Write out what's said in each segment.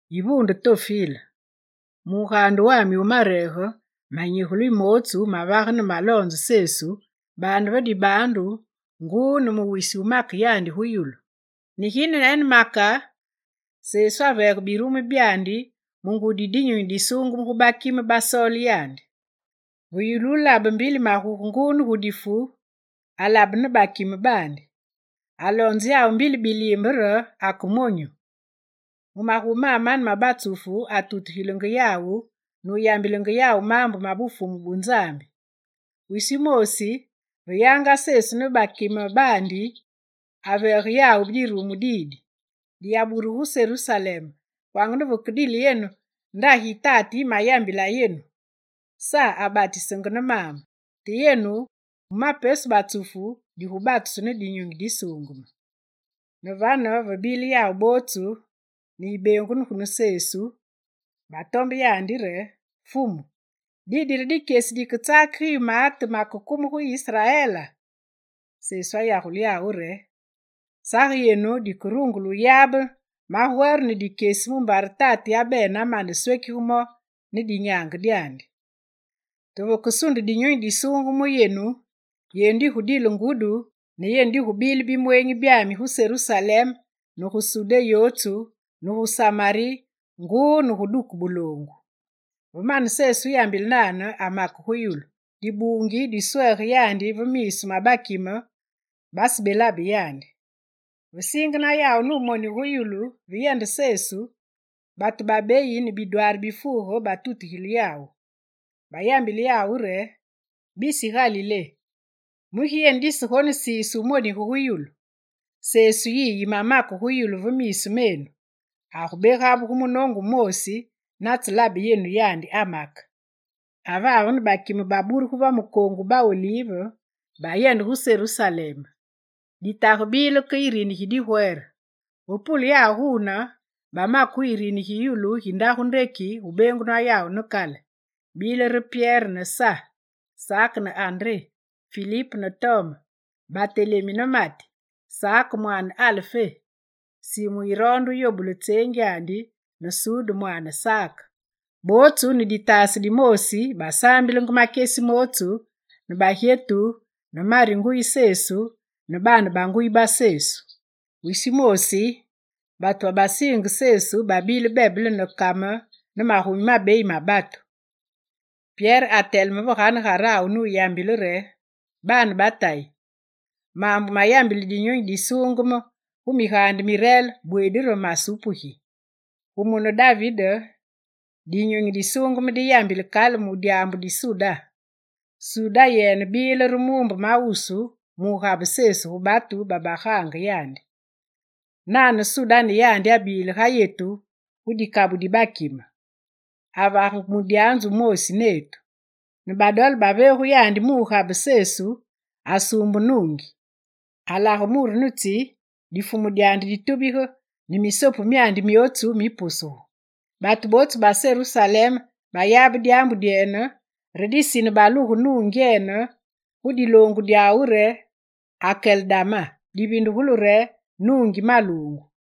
Yivuunde Tofile, mu mugaande wami wu mareege manyigule mootsu mavage ne maloonze Sesu baande ve dibaandu, nguu ne mu wisi wumake yandi gu yulu. Ne ginene make, Sesu aveege birumu byandi mu ngudi yi Dinyunyi Disuungeme gu bakime basoole yandi. Ve yulu wulabe mbili maguge nguu ne gu difu, alabene ne bakime baandi. Aloonze yawu mbili biliimbe re ake monyu. Mu magumi mamane ma batsufu atutugilenge yawu nuyambilenge yawu maambu ma Bufumu bu Nzambi. Wisi wumoosi, ve yanga Sesu ne bakime baandi, aveege yawu dirumu didi: «Diyaburugu gu Serusalem kwanga ne vakedile yenu ndagi yi Tate yimayambila yenu. Sa abatisenge ne maambe, te yenu, mu ma pesu batsufu, digubatusu ne Dinyunyi Disuungeme.» Ne vane, ve bile yawu bootsu ne yibeengunu ne Sesu, batombe yandi re: «Fumu, didi re dikyesi diketsakige yu maate makekume gu Israela?» Sesu ayagule yawu re: Sage yenu badikerungule wuyabe magwere ne makyesi mumbare Tate yabene amane wuswekige mo ne dinyaange dyandi. Te vakesunde Dinyunyi Disuungeme mu yenu, yenu digudile ngudi ne yenu di gubile bimweenyi byami gu Serusalem ne gu Sudé yotsu ne gu Samari nguu ne gu duke buloongu. Ve mane Sesu wuyambile nane amake gu yulu, dibuungi diswege yandi ve miisu ma bakime, basebelabe yandi. Ve siingena yawu numonige gu yulu ve yende Sesu, batu babeyi ne bidwaari bifuuge batutugile yawu. Bayambile yawu re: «Bisi Galilé, mugi yenu disegonesiise wumonige gu yulu? Sesu yiyi yimamake gu yulu ve miisu menu, agubegabuge munoongu wumoosi natselabe yenu amake.» Avavene bakime baburugu va mukoongu wu ba Olive, bayende gu Serusalem. Ditage dibile ke yirini gi digwere. Ve pule yawu guune, bamake gu yirini gi yulu gi ndagu ndeki gu beengunwa yawu ne kale. Bile re: Pyere ne Sa, Sake ne André, Filip ne Tome, Batelemi ne Mati, Sake mwaane Alfé, Simu yironde yobule tseengyandi ne Sude mwaane Sake. Bootsu ne ditaase dimoosi basaambilenge makyesi mootsu ne bagyetu ne Mari nguyi Sesu ne baane ba nguyi ba Sesu. Wisi wumoosi, batu babasiinge Sesu babile bebele ne kame ne magumi mabeyi ma batu. Pyere ateleme ve ganegarawu nuyambile re: «Baane ba tayi, maambu mayambile Dinyunyi Disuungeme gu Migaande Mireele, bweedi re masupugi: Gu mune David, Dinyunyi Disuungeme diyambile kale mu dyaambu di Suda. Suda yene bile re muumbe wu mawusu mugabe Sesu gu batu babagaange yandi. Nane Suda ne yandi abile ga yetu gu dikabu di bakime. Avagenge mudyanzu wumoosi netu. Ne badole ba veegu yandi mu wugabe Sesu, asuumbe nuungi. Alage muru ne tsi, difumu dyandi ditubige ne misopu myandi myootsu mipusugu. Batu bootsu ba Serusalem bayabe dyaambu dyene, re disine baluge nuungyene gu diloongu dyawu re Akeldama, divindugulu re, nuungi maluungu.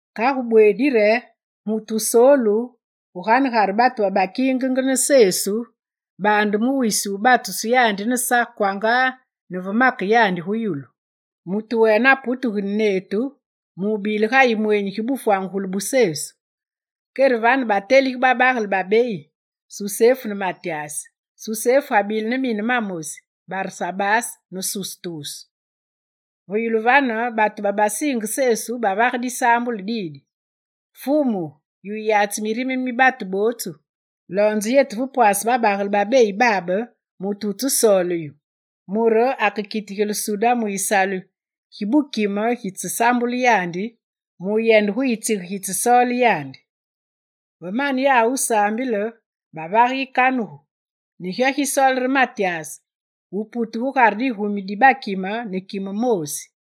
Kagu bweedi re mutu wusoolu gugare batu babakiingenge ne Sesu, baande wisi wu batusu yandi ne Sa kwanga ne ve make yandi gu yulu. Mutu wene aputegene netu mubile ga yimweenyi gi bufwangugulu bu Sesu.» Kere vane batelige babagele babeyi: Susefu ne Matyas. Susefu abile ne mine mamosi, Barsabase ne Sustus. Ve yulu vane batu babasiinge Sesu bavage disaambulu didi: «Fumu, yu wuyatsi mirime mi batu bootsu loonze yetu ve pwase babagele babeyi babe mutu wutsesoole yu, mure akekitigile Suda mu yisalu gi bukime gitsesaambule yandi muyende gu yitsige gitsesoole yandi.» Ve mane wusaambile yawu bavage yikanugu, ne gyo gisoole re Matyas wuputu gugare digumi di bakime ne kime moosi.